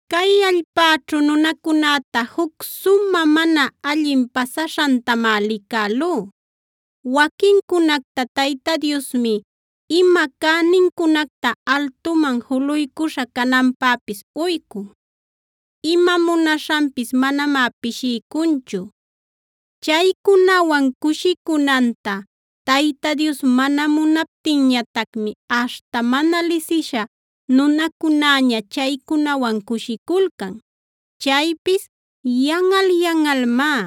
Cay allpäćhu nunacunäta juc sumä mana allin pasaśhantamá licälú. Waquincunacta Tayta Diosmi ima cänincunacta altuman juluycuśha cananpäpis uycun; ima munaśhanpis manamá pishiycunchu. Chaycunawan cushicunanta Tayta Dios mana munaptinñatacmi aśhta mana lisisha nunacunäña chaycunawan cushiculcan. Chaypis yanꞌal-yanꞌalmá;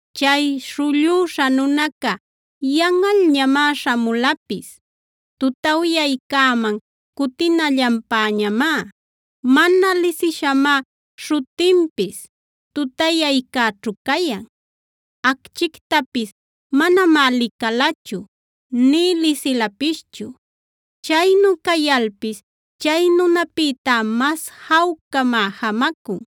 Chay śhullüśha nunaca yanꞌalñamá śhamulapis; tutawyaycäman cutinallanpäñamá. Mana lisishamá śhutinpis tutayaycäćhu cayan. Acchictapis manamá licalachu, nï lisilapischu. Chaynu cayalpis chay nunapïtá mas jawcamá jamacun.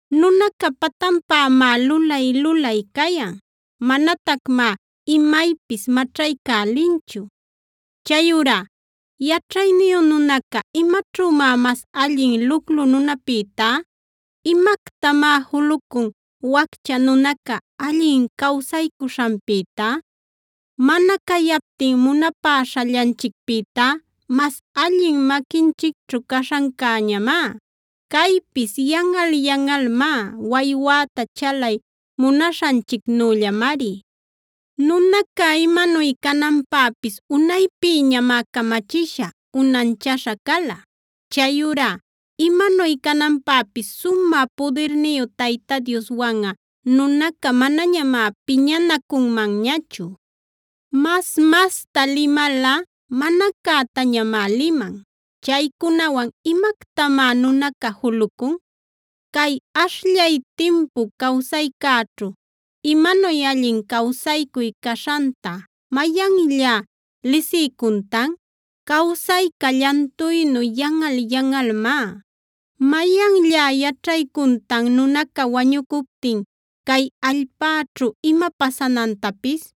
Nunaca patanpämá lulay-lulay cayan; manatacmá imaypis maćhaycälinchu. Chayurá ¿yaćhayniyu nunaca imaćhümá mas allin luclu nunäpïtá? ¿Imactamá julucun waccha nunaca allin cawsaycuśhanpïtá? Mana cayaptin munapäśhallanchicpïtá mas allin maquinchicćhu caśhancäñamá. Caypis yanꞌal-yanꞌalmá; waywäta chalay munaśhanchicnüllamari. Nunaca imanuy cananpäpis unaypïñamá camachisha, unanchaśha cala. Chayurá imanuy cananpäpis sumä pudirniyu Tayta Dioswanꞌa nunaca manañamá piñanacunmanñachu. Mas-masta limalꞌa mana cätañamá liman. Chaycunawan ¿imactamá nunaca julucun? Cay ashllay timpu cawsaycäćhu ¿imanuy allin cawsaycuy caśhanta mayanllá lisiycuntan? Cawsayca llantuynu yanꞌal-yanꞌalmá.b ¿Mayanllá yaćhaycuntan nunaca wañucuptin cay allpäćhu ima pasanantapis?